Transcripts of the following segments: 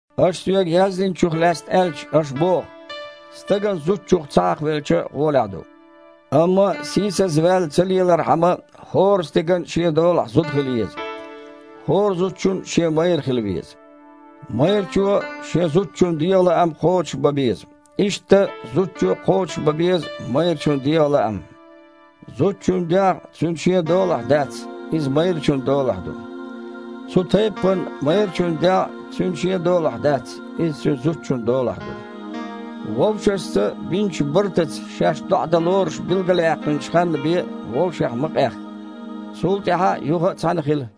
Аша соьга яздинчух лаьцна аьлча, аша боху: «Стагана зудчух ца хьакхавелча гІолехь ду». Амма сийсазваьлла ца лелархьама, хІора стеган а шен долахь зуда хила еза. ХІора зудчун а шен майра хила веза. Майрачо шен зудчун дегІан лаам кхочушбан беза. Иштта зудчо а кхочушбан беза майрачун дегІан лаам. Зудчун дегІ цуьнан шен долахь дац, иза майрачун долахь ду. Цу тайппана майрачун дегІ а цуьнан шен долахь дац, иза цуьнан зудчун долахь ду. Вовшашца бинчу бартаца шаьш доІа дан лоруш билгалъяьккхинчу ханна бен, вовшех ма къахка. Цул тІаьхьа юха а цхьаьна хила,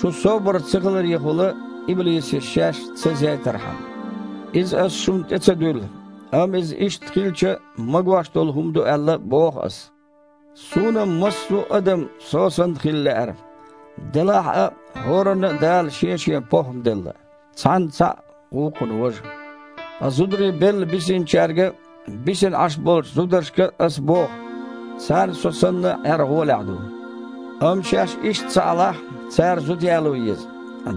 шун собар цахиларехула иблисе шаьш ца зейтархьама. Иза аса шуна тІе ца дуьллу, амма иза иштта хилча магош долу хІума ду аьлла боху аса. Суна-м массо а адам со санна хила лаьара, делахь а хІоранна а Дала шен-шен похІма делла: цхьанна – цхьаъ, вукхунна – важа. Ткъа зударий белла бисинчаьрга а, бисина Іаш болчу зударшка а аса боху: «Царна со санна Іер гІолехь ду». Амма шаьш иштта ца Іалахь, цара зуда яло еза.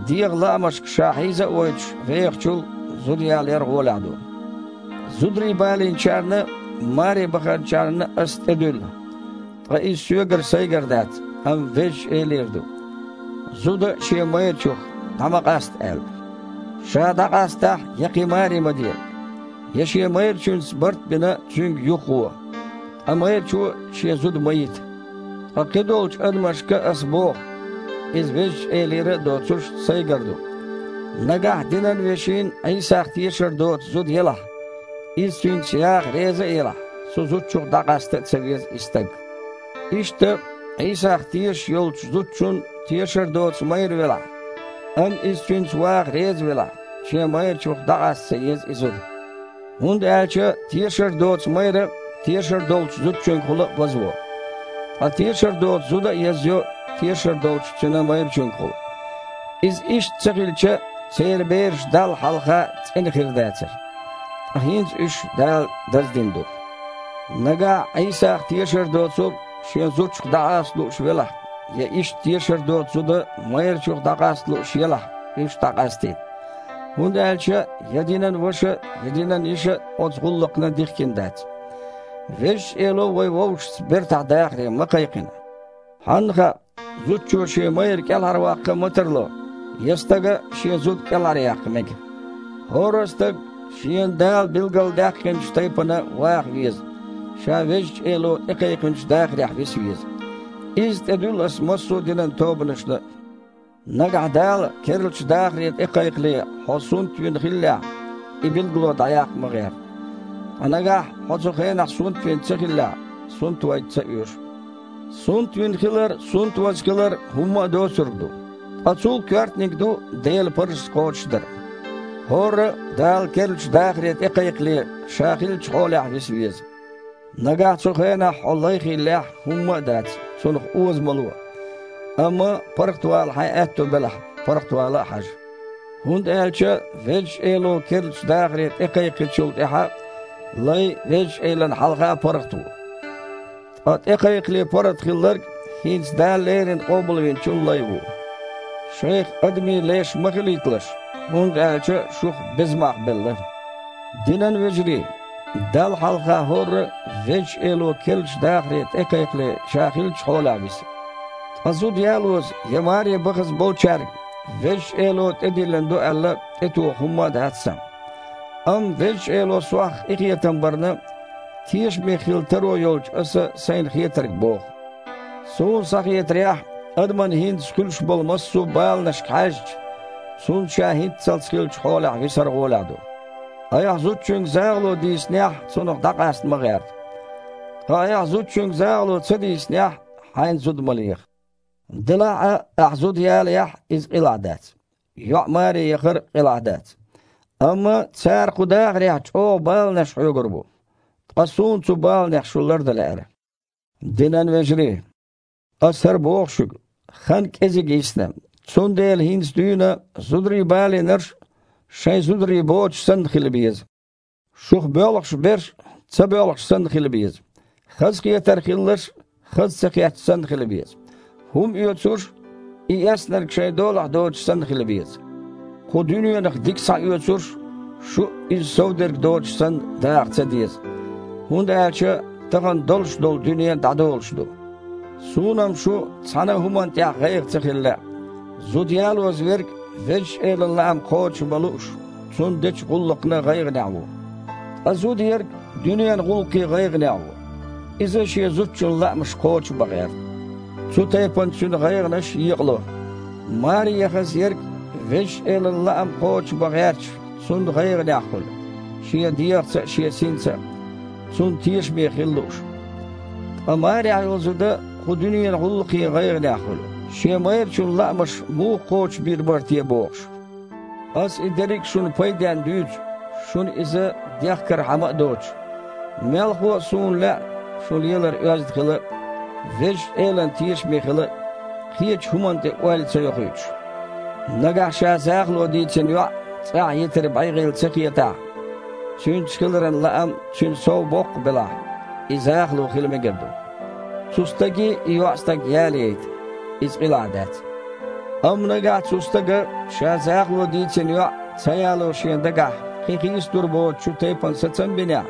ДегІан лаамашка ша хьийза а войтуш вехачул, зуда ялаяр гІолехь ду. Зударий балийначарна а, маре баханчарна а аса тІедуьллу (ткъа иза соьгара сайгара дац, амма Везачу Элера ду), зуда шен майрачух дІа ма къаста аьлла. Ша дІакъастахь, я кхин маре ма де, я шен майрачуьнца барт а бина, цуьнга юхагІо. Ткъа майрачо а шен зуда ма йита. Ткъа кхидолчу адамашка аса боху (иза Везачу Элера а доцуш, сайгара ду), нагахь динан вешин Іийсах тешар доцу зуда елахь, иза цуьнца яха реза а елахь, цу зудчух дІакъаста ца веза и стаг. Иштта, Іийсах тешаш йолчу зудчун тешар доцу майра велахь, амма иза цуьнца ваха реза велахь, шен майрачух дІакъаста ца еза и зуда. ХІунда аьлча тешар доцу майра тешар долчу зудчуьнгахула вазво. Ткъа тешар доцу зуда а язйо тешар долчу цуьнан майрачуьнгахула. Иза иштта ца хилча, церан бераш Далла хьалха цІена хир дацара, ткъа хІинца уьш Дала даздина ду. Нагахь Іийсах тешар доцург шен зудчух дІакъаста лууш велахь, я иштта тешар доцу зуда майрачух дІакъаста лууш елахь, уьш дІакъастийта. ХІунда аьлча я динан ваша а, я динан йиша а оцу гІуллакхна дихкина дац. Везачу Эло вай вовшашца бертахь дахаре ма кхайкхина. Хьанна хаьа, зудчо шен майра кІелхьарваккха а ма тарло. Я стага а шен зуда кІелхьаръяккха мега. ХІорра а стаг шена Дала билгалдаьккхинчу тайпана ваха веза, ша Везачу Эло тІекхайкхинчу дахарехь виса веза. Изза тІедуьллу аса массо а динан тобанашна а. Нагахь Дала керлачу дахаре тІекхайкхале хьо сунтвина хиллехь – и билгало дІаяккха ма гІерта. Ткъа нагахь хьо цу хенахь сунтвина ца хиллехь – сунтвайта ца оьшу. Сунтвина хилар а, сунтваза хилар а – хІумма а доцург ду. Ткъа цул а коьртаниг ду Делан парзаш кхочушдар. ХІорра а, Дала керлачу дахаре тІекхайкхале, ша хиллачу хьолехь виса веза. Нагахь цу хенахь хьо лай хиллехь, хІумма а дац, цунах оза ма ло. Амма паргІатвала хьайн аьтто белахь, паргІатвала а хьажа. ХІунда аьлча Везачу Эло керлачу дахаре тІекхайкхинчул тІаьхьа лай Везачу Элана хьалха паргІат ву. Ткъа тІекхайкхале паргІат хилларг – хІинца Дала леррина Къобалвинчун лай ву. Шайх адамийн леш ма хилийталаш, хІунда аьлча шух беза мах белла. Динан вежарий! Далла хьалха хІорра а Везачу Эло керлачу дахаре тІекхайкхале ша хиллачу хьолехь виса. Ткъа зуда ялоза я маре бахаза болчаьрга, Везачу Эло тІедиллина ду аьлла, тІетоха хІумма а дац сан. Амма Везачу Эло сох къинхетам барна, тешаме хила таро йолчу аса сайна хетарг боху. Суна схьахетарехь, адаман хІинца хуьлуш болу массо а баланашка хьаьжча, цунна ша хІинццалц хиллачу хьолехь висар гІолехь ду. Айхьа зудчуьнга захало дийцинехь, цунах дІакъаста ма гІерта. Ткъа айхьа зудчуьнга захало ца дийцинехь, хьайна зуда ма леха. Делахь а ахьа зуда ялаяхь а – иза къилахь дац. ЙоІ маре яхар а къилахь дац. Амма цара кху дахарехь чІогІа баланаш хьоьгур бу. Ткъа суна цу баланех шу лардан лаьара. Динан вежарий! Аса хІара боху шуьга: хан кІезиг йисна, цундела хІинца дуьйна зударий балийнарш а, шайн зударий боцуш санна хила беза. Шух боьлхуш берш а ца боьлхуш санна хила беза. Хазахетар хилларш а хаза ца хетча санна хила беза. ХІума оьцурш а и эцнарг шайн долахь доцуш санна хила беза. Кху дуьненах дика схьаоьцурш, шу а иза совдерг доцуш санна, даха ца деза, хІунда аьлча тахана долуш долу дуьне дІадолуш ду. Суна-м шун цхьана а хІуманна тІехь гІайгІа ца хила лаьа. Зуда ялоза верг, Везачу Элан лаам кхочушбан лууш, Цунна дечу гІуллакхна гІайгІанехь ву. Ткъа зуда ерг дуьненан гІуллакхийн гІайгІанехь ву. Иза шен зудчун лаамаш кхочушбан гІерта. Цу тайпана цуьнан гІайгІанаш екъало. Маре яхаза ерг, Везачу Элан лаам кхочушбан гІерташ, Цунна гІайгІанехь хуьлу, шен дегІаца а, шен синца а Цунна тешаме хила лууш. Ткъа марехь йолу зуда кху дуьненан гІуллакхийн гІайгІанехь хуьлу, шен майрачун лаамаш муха кхочушбийр бара те бохуш. Аса и дерриг а шуна пайденна дуьйцу, шуна иза дехкархьама а доцуш. Мелхо а, суна лаьа, шун лелар оьзда хила а, Везачу Элана тешаме хила а, кхечу хІуманна тІе ойла ца йохуьйтуш. Нагахь ша захало дийцина йоІ цІахь йитар бегІийла ца хетахь, цуьнца хиларан лаам цуьнан сов боккха белахь, и захало хила мегар ду. Цу стаге и йоІстаг ялаяйта, иза къилахь дац. Амма нагахь цу стага ша захало дийцина йоІ ца яло шен дагахь кхин хийцалур боцучу тайпана сацам а бинехь,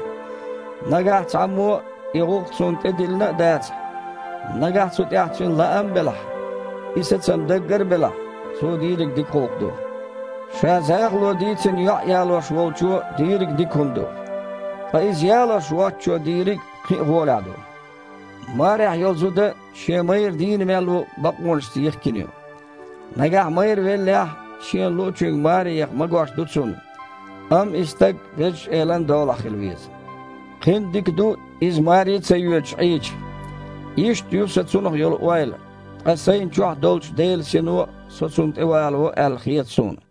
нагахь цхьаммо а и гІуллакх цунна тІедиллина а дацахь, нагахь цу тІехь цуьнан лаам а белахь, и сацам даггара а белахь, цо дийриг дика гІуллакх ду. Ша захало дийцина йоІ ялош волчо дийриг а дика хІума ду, ткъа иза ялош воцчо дийриг кхин а гІолехь ду. Марехь йолу зуда, шен майра дийна мел ву, бакъонашца йихкина ю. Нагахь майра веллехь, шена луъучуьнга маре яха магош ду цунна, амма и стаг Везачу Элан долахь хила веза. Кхин а дика ду, иза маре а ца йоьдуш Іийча. Иштта ю сан цунах йолу ойла, ткъа сайна чохь долчу Делан Сино со цунна тІе валаво аьлла хета суна.